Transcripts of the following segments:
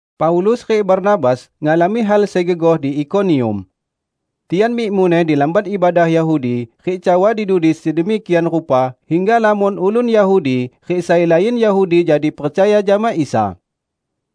Paulus rik Barnabas ngalami hal sai gegoh di Ikonium. Tian mik muneh di lamban ibadah Yahudi rik cawa di dudi sedemikian rupa hingga lamon ulun Yahudi rik sai lain Yahudi jadi percaya jama Isa.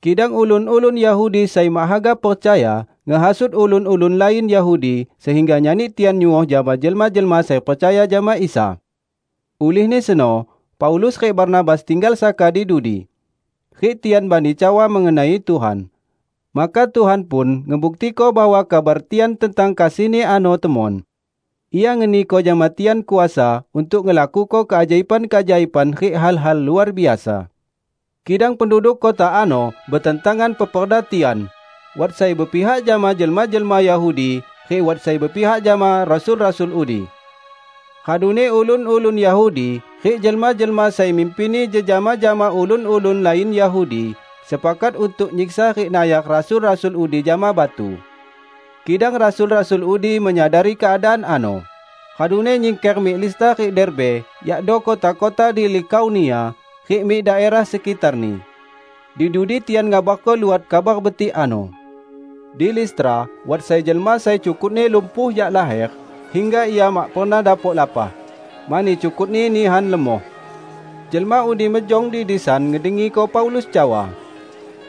Kidang ulun-ulun Yahudi sai mak haga percaya, ngehasut ulun-ulun lain Yahudi, sehingga nyani tian nyuoh jama jelma-jelma sai percaya jama Isa. Ulihni seno Paulus rik Barnabas tinggal saka di dudi. Rik tian bani cawa mengenai Tuhan. Maka Tuhan pun ngebuktiko bahwa kabar tian tentang kasih-Ni ano temon; Ia ngeniko jama tian kuasa untuk ngelakuko keajaiban-keajaiban rik hal-hal luar biasa. Kidang penduduk kota ano betentangan peperda tian; wat sai bepihak jama jelma-jelma Yahudi rik wat sai bepihak jama rasul-rasul udi. Raduni ulun-ulun Yahudi rik jelma-jelma sai mimpinni jejama jama ulun-ulun lain Yahudi sepakat untuk nyiksa rik nayar rasul-rasul udi jama batu. Kidang rasul-rasul udi menyadari keadaan ano, raduni nyingker mik Listra rik Derbe, yakdo kota-kota di Likaonia, rik mik daerah sekitarni. Di dudi tian ngabarko luot Kabar Betik ano. Di Listra wat sai jelma sai cukutni lumpuh jak laher, hingga ia mak pernah dapok lapah, mani cukutni nihan lemoh. Jelma udi mejong di disan ngedengiko Paulus cawa.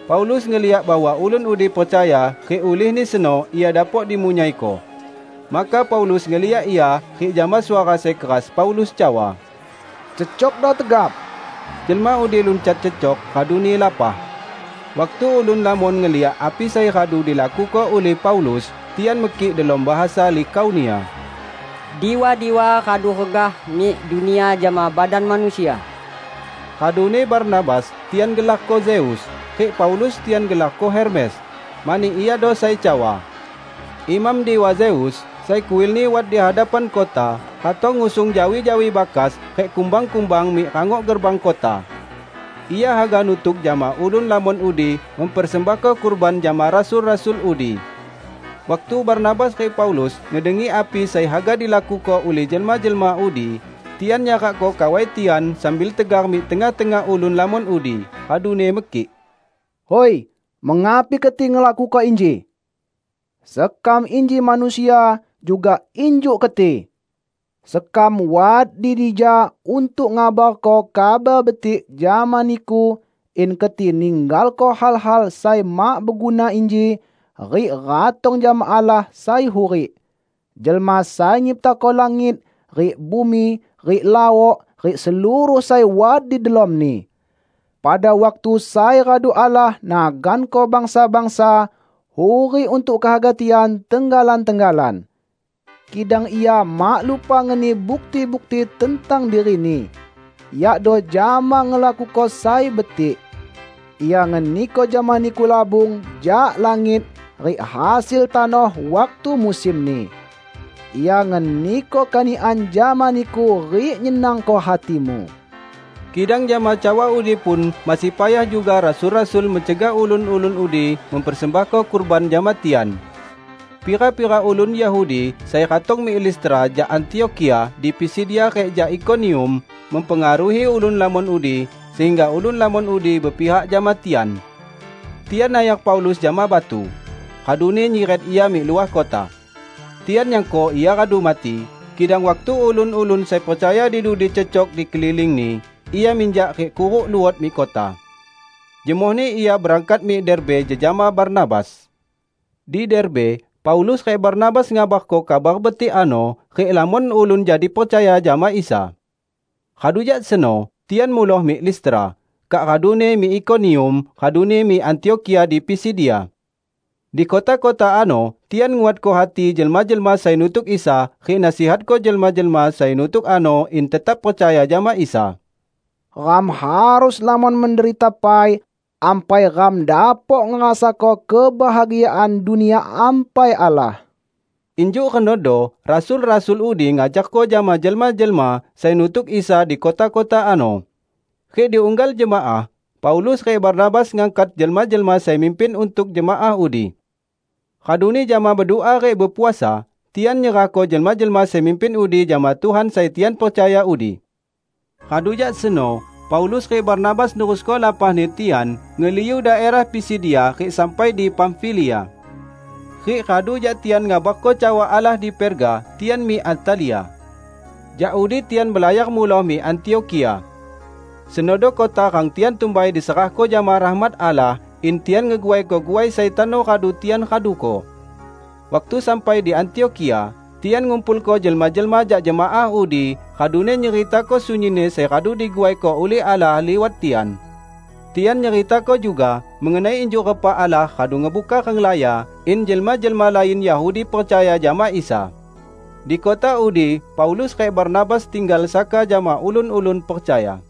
Paulus ngeliak bahwa ulun udi percaya rik ulihni seno ia dapok dimunyaiko. Maka Paulus ngeliak ia rik jama suara sai keras Paulus cawa, "Cecokdo tegap!" Jelma udi luncat cecok raduni lapah. Waktu ulun lamon ngeliak api sai radu dilakuko ulih Paulus, tian mekik delom bahasa Likaonia, "Diwa-diwa, radu regah mik dunia jama badan manusia." Raduni Barnabas tian gelarko Zeus, rik Paulus tian gelarko Hermes, mani iado sai cawa. Imam Diwa Zeus, sai kuilni wat di hadapan kota, ratong ngusung jawi-jawi bakas rik kumbang-kumbang mik rangok gerbang kota. Ia haga nutuk jama ulun lamon udi mempersembahko kurban jama rasul-rasul udi. Waktu Barnabas rik Paulus ngedengi api sai haga dilakuko ulih jelma-jelma udi, tian nyarakko kawai tian sambil tegar mik tengah-tengah ulun lamon udi, raduni mekik, "Hui, mengapi keti ngelakuko inji? Sekam inji manusia juga injuk keti! Sekam wat di dija untuk ngabarko Kabar Betik jama niku in keti ninggalko hal-hal sai mak beguna inji rik ratong jama Allah sai hurik, jelma sai nyiptako langit rik bumi rik laok rik seluruh sai wat di delomni. Pada waktu sai radu Allah naganko bangsa-bangsa hurik untuk kehaga tian tenggalan-tenggalan. Kidang Ia mak lupa ngeni bukti-bukti tentang diri-Ni, yakdo jama ngelakuko sai betik. Ia ngeniko jama niku labung jak langit rik hasil tanoh waktu musimni. Ia ngeniko kanikan jama niku rik nyenangko hatimu." Kidang jama cawa udi pun masih payah juga rasul-rasul mencegah ulun-ulun udi mempersembahko kurban jama tian. Pira-pira ulun Yahudi sai ratong mik Listra jak Antiokhia di Pisidia rik jak Ikonium mempengaruhi ulun lamon udi sehingga ulun lamon udi bepihak jama tian. Tian nayar Paulus jama batu, raduni nyiret ia mik luah kota. Tian nyangko ia radu mati, kidang waktu ulun-ulun sai percaya di dudi cecok di kelilingni, ia minjak rik kuruk luot mik kota. Jemohni ia berangkat mik Derbe jejama Barnabas. Di Derbe, Paulus rik Barnabas ngabarko Kabar Betik ano rik lamon ulun jadi percaya jama Isa. Radu jak seno tian muloh mik Listra, kak raduni mik Ikonium, raduni mik Antiokhia di Pisidia. Di kota-kota ano tian nguatko hati jelma-jelma sai nutuk Isa rik nasihatko jelma-jelma sai nutuk ano in tetap percaya jama Isa. "Ram harus lamon menderita pai, ampai ram dapok ngerasako kebahagiaan Dunia Ampai Allah," injuk renodo rasul-rasul udi ngajarko jama jelma-jelma sai nutuk Isa di kota-kota ano. Rik di unggal jemaah, Paulus rik Barnabas ngangkat jelma-jelma sai mimpin untuk jemaah udi. Raduni jama bedua rik bepuasa, tian nyerahko jelma-jelma sai mimpin udi jama Tuhan sai tian percaya udi. Radu jak seno Paulus rik Barnabas nerusko lapahni tian ngeliu daerah Pisidia rik sampai di Pamfilia. Rik radu jak tian ngabarko cawa Allah di Perga, tian mik Atalia. Jak udi tian belayar muloh mik Antiokhia. Senodo kota rang tian tumbai diserahko jama rahmat Allah, in tian ngeguaiko guai sai tano radu tian raduko. Waktu sampai di Antiokhia, tian ngumpulko jelma-jelma jak jemaah udi, raduni nyeritako sunyinni sai radu diguaiko ulih Allah liwat tian. Tian nyeritako juga mengenai injuk repa Allah radu ngebuka renglaya in jelma-jelma lain Yahudi percaya jama Isa. Di kota udi Paulus rik Barnabas tinggal saka jama ulun-ulun percaya.